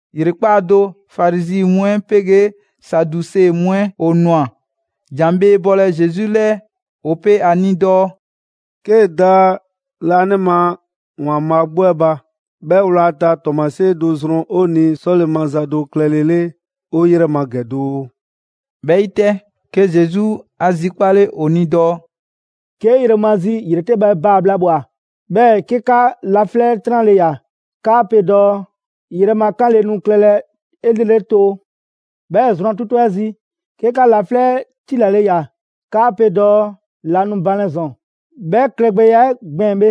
‑Yrekpaa' do, Farizi mu 'ɛ 'pegee Saduse mu 'ɛ ‑o ꞊nwa ‑jan bhee bɔlɛ Zesu 'lɛɛ. ‑O pe a ni dɔɔ: «'Kee‑ da Laanima ‑Waanbhaa' 'gbu 'ɛ ba, 'bhɛ 'wlata‑ 'tɔɔmasie do zrɔn 'o ni 'sɔle‑ maza do klɛlele 'o 'yrɛ ma ‑gɛ doo.» 'Bhɛ 'yi 'tɛ, 'ke Zesu 'a zikpale ‑o ni dɔɔ: [«'Ke yromazi ‑yretɛbhɛ baa‑ bhla ꞊bhwa, 'bhɛɛ‑ 'ke 'ka laflɛ' 'tranle ꞊ya, 'kaa pe dɔɔ: ‹Yrɛ ma 'kanle nu klɛlɛ 'elrele too›. 'Bhɛɛ‑ zrwan 'tutu 'ɛ zi, 'ke 'ka laflɛ' 'ɛ tilale ꞊ya, 'kaa pe dɔɔ: ‹La nu banlɛ ‑zɔn›. 'Bhɛ klɛgbɛya 'ɛ gbɛɛn‑ bhe,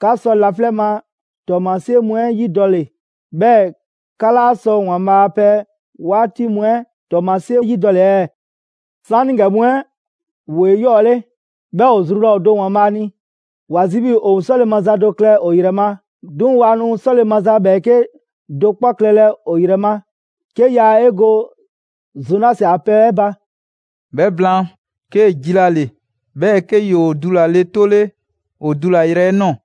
'ka sɔ laflɛ' ma ‑tɔɔmasie mu 'ɛ 'yidɔle, 'bhɛɛ‑ 'ka 'laa sɔ ‑Waanbhaa' a pɛ 'waati mu 'ɛ ‑tɔɔmasie 'yidɔle ɛɛ?] 'Saanigɛ mu 'ɛ ‑woo 'eyɔɔle, 'bhɛɛ‑ ‑o zru laa ‑o do ‑Waanbhaa' ni. ‑Wa zi 'bhii‑ ‑o 'sɔle‑ maza do klɛ ‑o ‑yrɛ ma, 'duŋ‑ waa nu 'sɔle‑ maza ‑bhɛɛke' do 'kpɔ klɛlɛ ‑o ‑yrɛ ma, 'ke yaa 'e go Zonasi a pɛ 'ɛ ba.» 'Bhɛ blaan, 'kee‑ jilale, 'bhɛɛ‑ 'ke ‑yoo dulale 'tole ‑o dulayrɛ 'ɛ ꞊nɔɔ.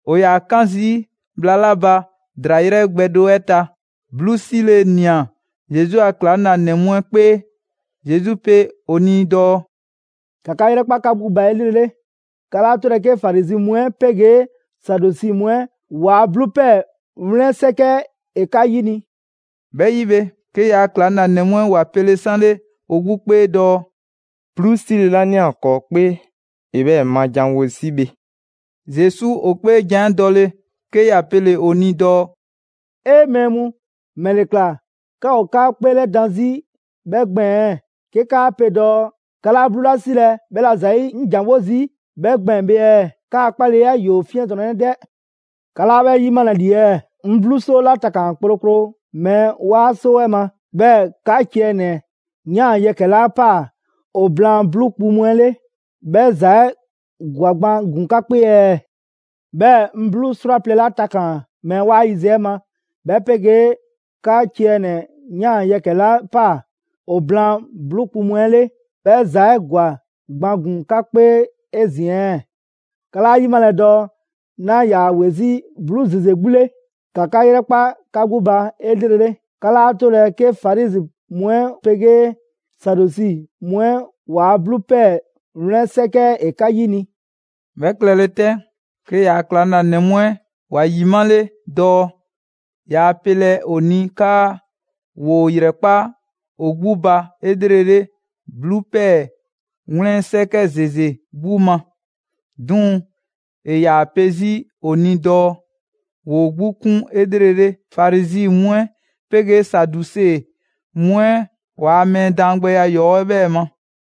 ‑O ‑yaa 'kan zii' bhla 'la ba ‑draa 'yrɛ gbɛ do 'ɛ ta, 'bluu 'sile‑ ꞊nia Zesu a ‑klaŋlanɛ mu 'ɛ 'kpee. Zesu pe ‑o ni dɔɔ: «‑Ka 'ka 'yrɛkpa 'ka 'gbu ba 'elrele. 'Ka 'laa 'tolɛ‑ 'ke Farizi mu 'ɛ 'pegee Saduse mu 'ɛ ‑waa' 'bluu ‑pɛɛ 'wlɛn 'sɛkɛ 'ɛ ‑e 'ka 'yini‑.» 'Bhɛ 'yi bhe, 'ke ‑yaa' ‑klaŋlanɛ mu 'ɛ ‑wa pele 'sanle ‑o 'gbu 'kpee dɔɔ: «'Bluu 'sile‑ 'la ꞊nia ‑kɔɔ' 'kpee ‑e 'bhɛɛ‑ ma ‑janwo' zii' bhe.» Zesu ‑o 'kpeejan‑ 'ɛ dɔle, 'ke ‑ya pele‑ ‑o ni dɔɔ: «'E! Mɛɛ mu, ‑mɛle ꞊kla 'ka ‑o 'ka 'kpeelɛdan 'zi 'bhɛ gbɛɛn‑ ɛɛ 'ke 'kaa pe dɔɔ 'ka 'laa 'bluu 'la 'silɛ‑ 'bhɛla‑ ‑zayi' 'ŋ ‑janwo' zii' 'bhɛ gbɛɛn‑ bhe ɛɛ? 'Kaa‑ 'kpaleya 'ɛ ‑yoo 'fiɛntrɔnnɛ 'dɛ! 'Ka 'laa 'bhɛ 'yimalɛ ‑li ɛɛ? 'Ŋ 'bluu 'soo 'la takaan‑ kplokplo mɛɛ 'waa 'soo 'ɛ ma, 'bhɛɛ‑ 'ka ciɛ ‑nɛ ꞊yan yɛkɛ‑ 'la ꞊paa ‑o blaan 'bluu kpu mu 'ɛ 'le, 'bhɛ ‑za 'ɛ ‑gwa gban ‑gun 'ka 'kpee ɛɛ? 'Bhɛɛ‑ 'ŋ 'bluu 'srwaplɛ‑ 'la takaan‑ mɛɛ 'waa yiziɛ 'ɛ ma, 'bhɛ 'pegee 'ka ciɛ ‑nɛ ꞊yan yɛkɛ‑ 'la ꞊paa ‑o blaan 'bluu kpu mu 'ɛ 'le, 'bhɛ ‑za 'ɛ ‑gwa gban ‑gun 'ka 'kpee 'ezin‑ ɛɛ? 'Ka 'laa 'yimalɛ dɔɔ 'naa ‑yaa ‑we 'zi 'bluu ‑zeze 'gbu 'le. ‑Ka 'ka 'yrɛkpa 'ka 'gbu ba 'elrele! 'Ka 'laa 'tolɛ‑ 'ke Farizi mu 'ɛ 'pegee Saduse mu 'ɛ ‑waa' 'bluu ‑pɛɛ 'wlɛn 'sɛkɛ 'ɛ ‑e 'ka 'yini.» 'Bhɛ klɛle 'tɛ, 'ke ‑yaa' ‑klaŋlanɛ mu 'ɛ ‑wa ‑yimale dɔɔ yaa pelɛ ‑o ni 'kaa ‑woo ‑yrɛkpa' ‑o 'gbu ba 'elrele 'bluu ‑pɛɛ 'wlɛn 'sɛkɛ ‑zeze 'gbu ma, 'duŋ‑ ‑e ‑yaa pe 'zi ‑o ni dɔɔ ‑woo 'gbu 'kun 'elrele Farizi mu 'ɛ 'pegeeSaduse mu 'ɛ ‑waa' mɛɛ daangbɛya ‑yɔɔ' 'ɛ 'bhɛɛ‑ ma.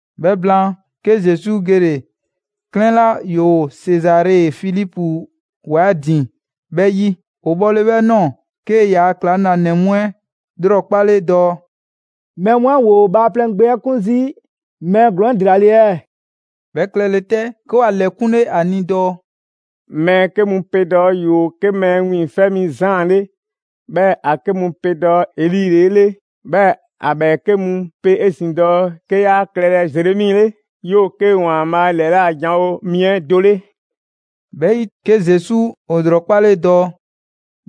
'Bhɛ blaan, 'ke Zesu gele‑ 'klɛɛn 'la ‑yoo Sezare Filipu ‑wa 'ɛ ‑din 'bhɛ 'yi. ‑O bhɔle 'bhɛ ꞊nɔɔ, 'kee‑ ‑yaa' ‑klaŋlanɛ mu 'ɛ 'lrɔkpale dɔɔ: «Mɛɛ mu 'ɛ ‑woo Bhaaplɛŋ Gbe 'ɛ 'kun zii' mɛɛ ‑glɔɔn 'ɛ ‑dela ‑le ɛɛ?» 'Bhɛ klɛle 'tɛ, 'ke ‑wa ‑lɛkunle ‑a ni dɔɔ: «Mɛɛ 'ke mu pe dɔɔ 'yoo‑ 'ke Mɛɛ Wiiŋfɛ' Mi Zaan 'le, 'bhɛɛ‑ ‑a 'ke mu pe dɔɔ Eli ‑le 'e 'le, 'bhɛɛ‑ ‑a ‑bhɛɛke' mu pe 'ezin‑ dɔɔ 'ke 'yaa klɛlɛ Zeremi 'le, 'yoo‑ 'ke ‑Waanbhaa' ‑lɛla' janwo mi 'ɛ do 'le.» 'Bhɛ 'yi, 'ke Zesu ‑o ‑lrɔkpale dɔɔ: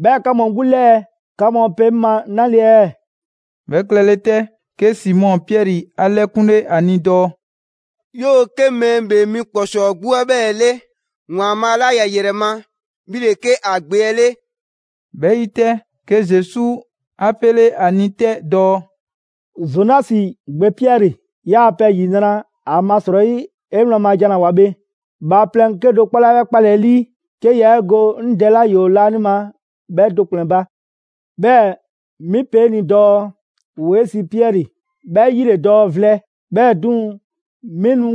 «'Bhɛɛ‑ 'ka mu 'gbu 'lɛɛ‑, 'ka mu pe 'ŋ ma 'nale‑ ɛɛ?» 'Bhɛ klɛle 'tɛ, 'ke Simɔ Piɛri 'a 'lɛkunle 'a ni dɔɔ: «'Yoo‑ 'ke Mɛɛ ‑Bhee Mi ‑Kpɔsɔɔ 'gbu 'ɛ 'bhɛɛ‑ 'le, ‑Waanbhaa' 'la ‑ya ‑yrɛ ma, 'bhi ‑le 'ke ‑a Gbe 'ɛ 'le.» 'Bhɛ 'yi 'tɛ, 'ke Zesu 'a 'pele 'a ni 'tɛ dɔɔ: «Zonasi gbe Piɛri, 'yaa‑ pɛ ‑yinra'! ‑Amasrɔyi 'e wlan ma jan 'la ꞊woa bhe, bhaaplɛŋ 'kedo‑ 'kpɔ laa 'bhɛ 'kpalɛ‑ 'e 'lii, 'ke yaa 'e go 'ŋ Dɛ 'la ‑yoo laanima 'bhɛ do ‑kplɛn ba. 'Bhɛɛ‑ 'mi pe 'e ni dɔɔ: ‑Woo 'e sii Piɛri, 'bhɛ 'yi ‑le dɔɔ vlɛ, 'bhɛɛ‑ 'duŋ‑, 'mi nu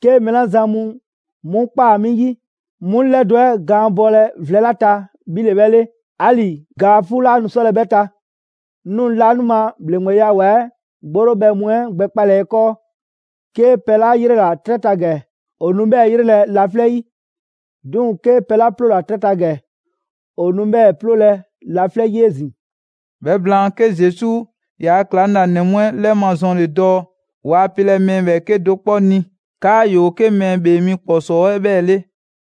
'ke mɛɛ 'la zan mu 'mu ꞊kpaa 'mi 'yi 'mu ‑lɛdo' 'ɛ gaan bɔlɛ vlɛ 'la ta, 'bhi ‑le 'bhɛ 'le. 'Ali‑ ga 'fuu 'laa nu 'sɔlɛ‑ 'bhɛ ta. 'Ŋ nu laanima ‑bhleŋgbeya ‑wa 'ɛ 'gborobhɛ mu 'ɛ gbɛkpalɛ 'e 'kɔɔ‑: 'Kee pɛ 'la 'yrela‑ 'trɛ ta ‑gɛ, ‑o nu 'bhɛɛ‑ 'yrelɛ‑ laflɛ' 'yi; 'duŋ‑ 'kee‑ pɛ 'la 'ploola‑ 'trɛ ta ‑gɛ, ‑o nu 'bhɛɛ‑ 'ploolɛ‑ laflɛ' 'yi 'ezin‑.» 'Bhɛ blaan, 'ke Zesu ‑yaa' ‑klaŋlanɛ mu 'ɛ 'lɛmazɔnle dɔɔ waa pelɛ mɛɛ ‑bhɛɛke' do 'kpɔ ni 'kaa 'yoo‑ 'ke Mɛɛ ‑Bhee Mi ‑Kpɔsɔɔ 'ɛ 'bhɛɛ‑ 'le.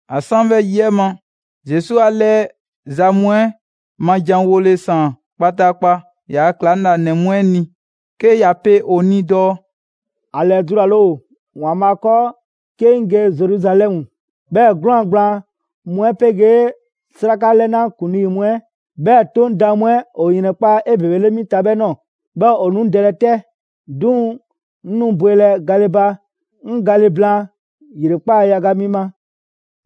‑A 'san 'bhɛ yi 'ɛ ma, Zesu 'a 'lɛɛ za mu 'ɛ ma janwole ‑saan kpataakpa ‑yaa' ‑klaŋlanɛ mu 'ɛ ni, 'ke ‑ya pe ‑o ni dɔɔ: «‑A ‑lɛdulale ‑o ‑Waanbhaa 'kɔɔ 'ke 'ŋ ge Zeruzalɛmu, 'bhɛɛ‑ 'gwlaan‑ gblaan mu 'ɛ 'pegee 'Sraka 'lɛna ‑kuŋlii mu 'ɛ, 'bhɛɛ‑ 'Toŋ daan mu 'ɛ, ‑o ‑yrɛnkpa' 'mi ta 'ebebele 'bhɛ ꞊nɔɔ. 'Bhɛɛ‑ ‑o nu 'ŋ dɛlɛ 'tɛ, 'duŋ‑ 'ŋ nu bwelɛ gale ba 'ŋ gale blaan ‑yrekpaa' yaga mi ma.»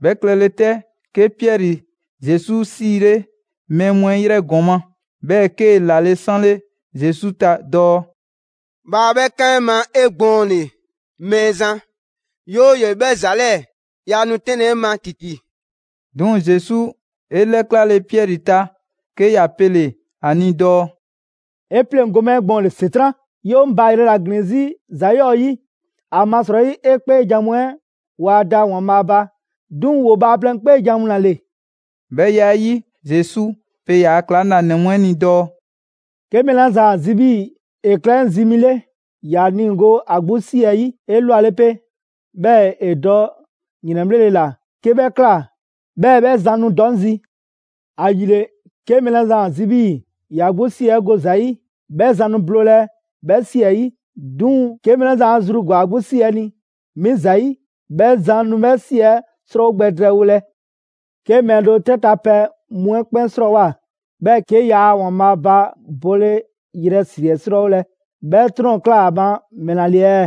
'Bhɛ klɛle 'tɛ, 'ke Piɛri Zesu 'siile mɛɛ mu 'ɛ 'yrɛ ‑gɔma', 'bhɛɛ‑ 'kee‑ ‑lale' 'sanle Zesu ta dɔɔ: «Bhaa 'bhɛ 'kan 'e ma 'egbɔɔnle, Mɛɛzan! 'Yooye‑ 'bhɛ ‑za 'lɛɛ‑, yaa nu 'tɛnlɛ‑ 'e ma ‑titi!» 'Duŋ‑ Zesu 'e 'lɛklale Piɛri ta, 'ke ‑ya pele‑ ‑a ni dɔɔ: «'E 'pleŋgo‑ 'ŋ ma 'egbɔɔnle, ‑Setran'! 'Yoo‑ 'ŋ baayrɛ ‑la ‑glin 'zi ‑za 'yɔɔ‑ 'yi, ‑amasrɔyi 'e 'kpeejan‑ mu 'ɛ waa da ‑Waanbhaa' ba, 'duŋ‑ ‑woo bhaaplɛŋ 'kpeejan‑ mu ‑la ‑le.» 'Bhɛ ya 'ɛ 'yi, Zesu pe ‑yaa' ‑klaŋlanɛ mu 'ɛ ni dɔɔ: «'Ke mɛɛ 'la zan ‑a zi 'bhii‑ ‑e klɛ 'ŋ zi mi 'le, ‑ya niigo ‑a 'gbu 'si ‑ɛ 'yi 'elwale 'pe, 'bhɛɛ‑ ‑e dɔ ‑yrɛnbhlele ꞊la, 'ke 'bhɛ ꞊kla, 'bhɛɛ‑ 'bhɛ zan nu dɔ 'ŋ zi. ‑Ayile, 'ke mɛɛ 'la zan ‑a zi 'bhii‑ ‑ya 'gbu 'si 'ɛ go ‑za 'yi, 'bhɛ zan nu bloolɛ 'bhɛ ꞊si 'ɛ 'yi. 'Duŋ‑ 'ke mɛɛ la zan 'e zru ‑gwa ‑a 'gbu 'si 'ɛ ni 'mi ‑zayi', 'bhɛ zan nu 'bhɛ ꞊si 'ɛ 'srɔɔwo gbɛ drɛɛwolɛ. 'Ke mɛɛ do 'trɛ ta pɛ mu 'ɛ 'kpɛn 'srɔɔwoa‑, 'bhɛɛ‑ 'ke yaa ‑Waanbhaa ba bole ‑yrɛ ‑si 'ɛ ‑srɔɔwolɛ, 'bhɛ 'trɔn‑ ꞊kla ‑a ma ‑mɛla ‑le ɛɛ?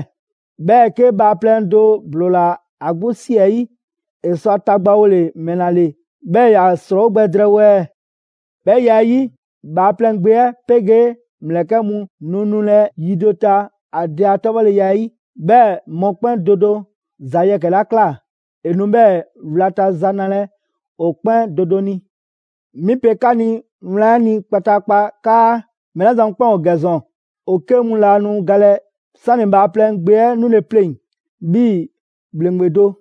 'Bhɛɛ‑ 'ke bhaaplɛŋ do ‑bloola ‑a 'gbu 'si 'ɛ 'yi, ‑e sɔ ‑a tagbawole ‑mɛla ‑le 'bhɛɛ‑ ‑ya ‑srɔɔwo' gbɛ drɛɛwo ɛɛ? 'Bhɛ ya 'ɛ 'yi, Bhaaplɛŋ Gbe 'ɛ 'pegee ‑mlɛkɛ' mu nu nulɛ yi do ta ‑a Dɛ a 'tɔbhɔleya 'ɛ 'yi, 'bhɛɛ‑ mɔkpɛn' do do ‑za yɛkɛ‑ 'la ꞊kla, ‑e nu 'bhɛɛ‑ wlata za nalɛ ‑o 'kpɛn do do ni. 'Mi pe 'ka ni wlan 'ɛ ni kpataakpa 'kaa mɛɛ 'la zan mu 'kpɛn ‑o ‑gɛ ‑zɔn, ‑o 'ke mu laa nu galɛ 'sani‑ Bhaaplɛŋ Gbe 'ɛ 'nule‑ pleŋ‑ 'bhii‑ ‑bhleŋgbe do.»